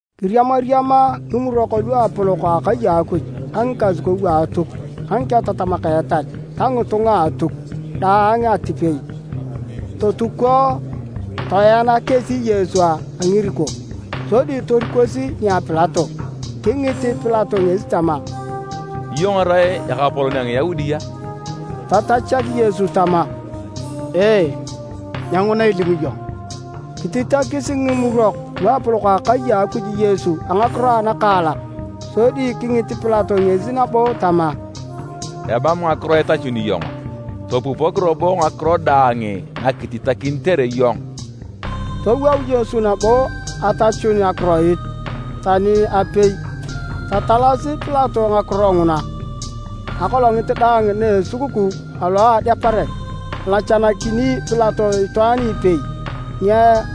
Kiriamariama Ngimurok Luapolok a akai a Akuj ka ngikasukou a Atuk ka ngiketatamak a etal ta ngitunga a Atuk daang atipei totuko. Toena kesi Yesu a ngiriko, sodi torikosi nia Pilato. Kingit Pilato ngesi tama, “Iyong irai ekapolon a Ngiyaudi a?” Tatachak Yesu tama, “Ee, nyenguna ilimu iyong.” Kititakis Ngimurok Luapolok a akai a Akuj Yesu a ngakiro anakaalak, sodi kingit Pilato ngesi nabo tama, “Emam ngakiro itachuni iyong a? Topupok robo ngakiro daang nakititakinitere iyong!” Towou Yesu nabo atachun akiroit tani apei, tatalasi Pilato ngakiro nguna. Akolongit daang na esukukuu alo Adeparet, alachanakini Pilato itwaan ipei ni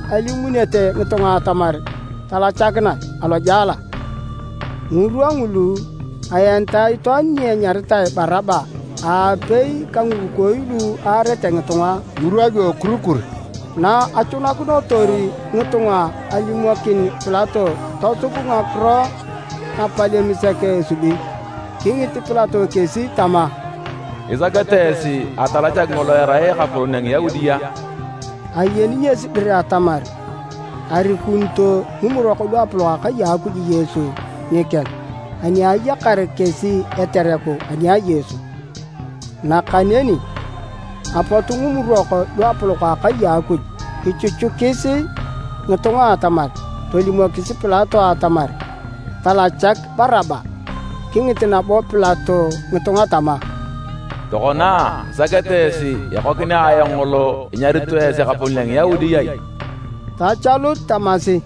alimunete ngitunga atamar talachakinae alojela. Ngirwa ngulu aenitae itwaan ni anyaritae Baraba aapei ka ngirukooi lu aarete ngitunga ngirwa lu ekurikur. Na achunakinotor ngitunga alimokin Pilato tosub ngakiro napalem sek esubi, kingit Pilato kesi tama, “Isakete esi atalachak ngolo erai ekapolon a Ngiyaudi a?” Ayeni ngesi dir atamar arikunito Ngimurok Luapolok a Akai a Akuj Yesu nikeng ani ayakar kesi etereku ani a Yesu. Nakaneni apot Ngimurok Luapolok a akai a Akuj kichuchukis ngitunga atamar tolimokis Pilato atamar talachak Baraba. Kingit nabo Pilato ngitunga tama, “Tokona, isakete esi ekokinea ayong ngolo inyarito esi ekapolon a Ngiyaudi ai?” Tachalut tamasi,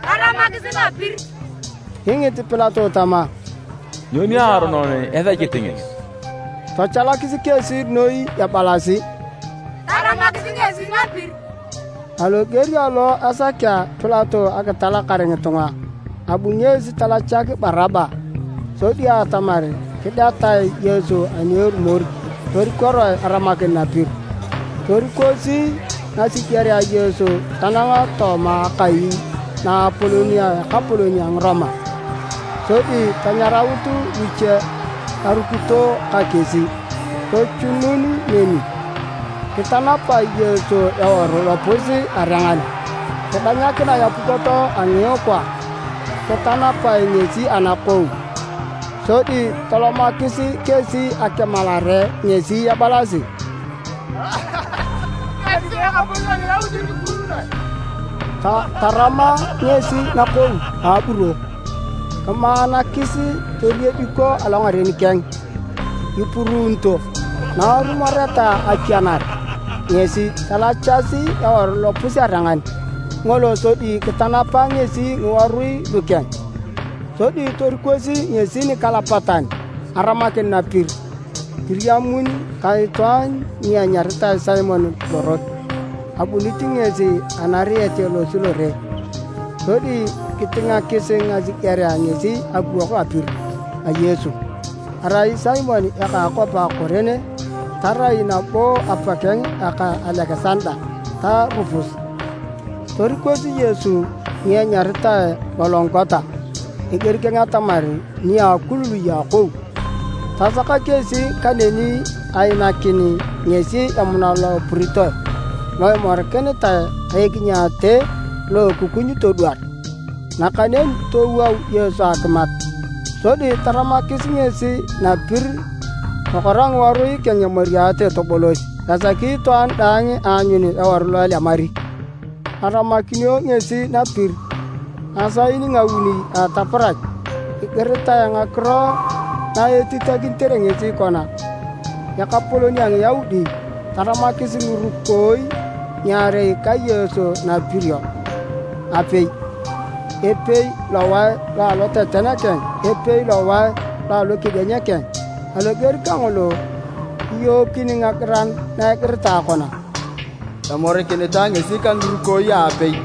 “Taramakisi napir!” Kingit Pilato tama, “Nyo niaronon esechit ngesi?” Tachalakis kesi noi ebalasi, “Taramakisi ngesi napir!” Aloger alo asakea Pilato akitalakar ngitunga, abu ngesi talachak Baraba. Sodi atamar kidetae Yesu ani erumor torikoroe aramakin napir. Torikosi ngasigerea Yesu tanang tooma akai naapolon a ekapolon a Ngiroma sodi tanyaraut luche arukito ka kesi tochunun neni. Kitanapae Yesu eworu lopus-arengan. Kidanyakinae apukot a ngiikwa, kitanapae ngesi anakou. Sodi tolomakis kesi akimalare ngesi ebalasi, “Kimiekisi Ekapolon a Ngiyaudi kipuruunoe.” Tarama ngesi nakou a aburo, kimaanakis, toriediko alongaren keng ipuruunito. Na arumoreta akianar ngesi, talachasi eworu lopus-arengan ngolo sodi kitanapa ngesi ngiworui lukeng. Sodi torikosi ngesi nikalapatan aramakin napir. Kiriamun ka itwaan ni anyaritae Simon lorot. Abunit ngesi anariet alosi lore. Sodi kitingakis ngasigerea ngesi akiwok apir a Yesu. (Arai Simon eka a akwap a Kurene, tarai nabo apakeng ka Alekisanda ta Rupus). Torikosi Yesu ni anyaritae Gologota, eger keng atamar, “Nia Akulului a Akou.” Tasaka kesi kaneni ainakin ngesi emuna lo epuritoe lo emorikinitae ka ekinyaate lo ekukuny todwar, nakaneni towou Yesu akimat. Sodi taramakis ngesi napir, tokora ngiworui keng emariate tobolos esaki itwaan daang aanyun eworu lo elemari. Aramakinio ngesi napir ngisaae nguuni a ataparach. Egiritae ngakiro na etitakinitere ngesi kona: “Ekapolon a Ngiyaudi.” Taramakis ngirukooi ngiarei ka Yesu napirio aapei, epei lowae lo aloteten keng, epei lowae lo a alokedieny keng. [ Aloger kangolo, kiyookin ngagiran na igiritae kona, “Emorikinitae ngesi ka ngirukooi aapei.”]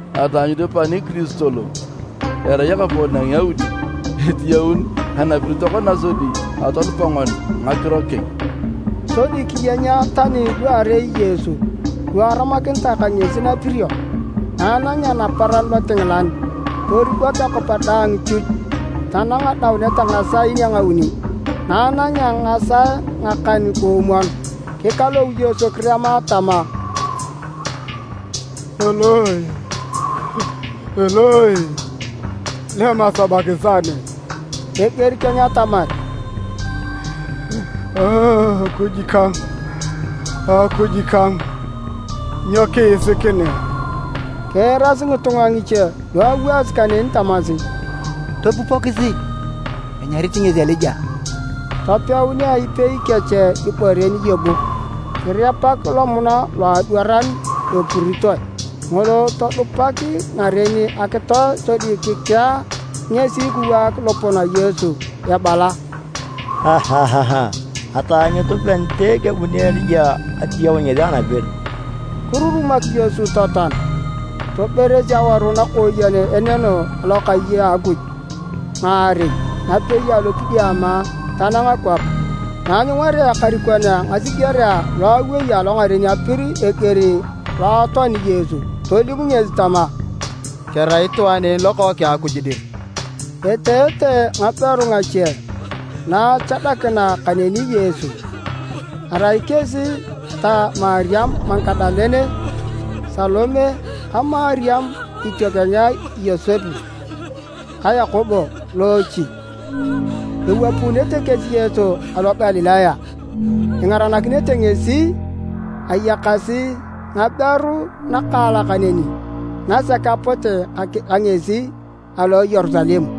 Ataanyutu pan Kiristo lo erai Ekapolon a Ngiyaudi etiyaun anapir tokona sodi atonupa ngoni ngakiro keng!” Sodi kiyenya tani luarei Yesu, lu aramakinitae ka ngesi napirio. Na anangea naparan lotingilan toribok akwap daang chuch tanang adaunet a ngisaae a nguuni. Na anangea ngisaae ngikan-koomwon, kikalou Yesu kirema tama, “Eloi, Eloi, lema sabakisani?” Eger keng atamar, “Akuj kang, Akuj kang, nyo kiisikinea?” Kiirasi ngitunga ngiche lu awaasi kaneni tamasi, “Topupokisi, enyarit ngesi Elija!” Topeunea ipei kech ibore niyebuk kirepak lomuna loadwaran apuritoe ngolo, todupak ngaren akitoe sodi kikea ngesi kiwaak lopon a Yesu ebala, “Ataanyutu panite kebuni Elija atiyaun ngesi anapir!” Kirurumak Yesu totoan. Toberes aworu nakooyen eneno alokai a Akuj ngaarei napei alokidiama tanang kwap. Na anyungarea ekarikon a ngasigerea lo awei alongaren apir eger lo atoani Yesu, tolim ngesi tama, “Kerai itwaan en Lokookeng a Akuj dir!” Eteete ngaberu ngache na achadakina kaneni Yesu. Arai kesi ta Mariam Magadalene, Salome ka Mariam itiokeng a Yosep ka Yakobo loochi. Ewapuunete kesi Yesu alo Galilaya ingaranakinete ngesi. Ayakasi ngaberu nakaalak neni nasek apote ka ngesi alo Yerusalem.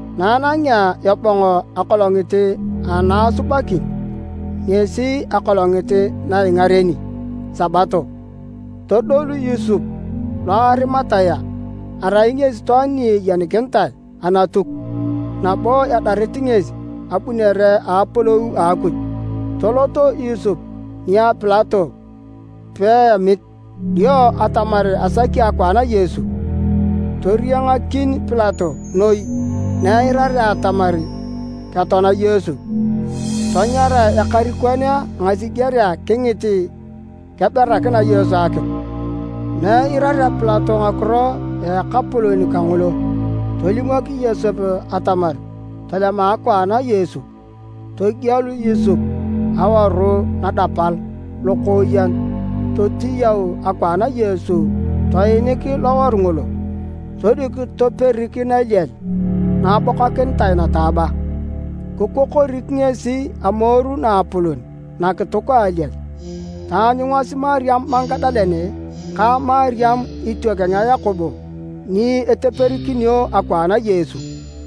Na anangea ebong a akolongit ana Asubakin, (ngesi akolongit na ingareni Sabato), todolu Yosep lo a Arimatea. Arai ngesi itwaan ni ayenikinitae Anatuk nabo edarit ngesi abunere a apolou a Akuj. Tolot Yosep nia Pilato peemit dio atamar asaki akwaan a Yesu. Toriangakin Pilato noi na eirarea atamar ketoana Yesu. Tanyara ekarikon a ngasigerea kingit keberakina Yesu akitu. Na eirarea Pilato ngakiro a ekapolon kangolo, tolimok Yosep atamar tolema akwaan a Yesu. Togielu Yosep eworu lodapal lokooyen totiyau akwaan a Yesu toinik loworu ngolo, sodi kitoperik naliel naabokakinitae nataaba. Kikokorik ngesi amoru naapolon nakituk a aliel. Taanyungasi Mariam Magadalene ka Mariam itiokeng a Yakobo ni eteperikinio akwaan a Yesu.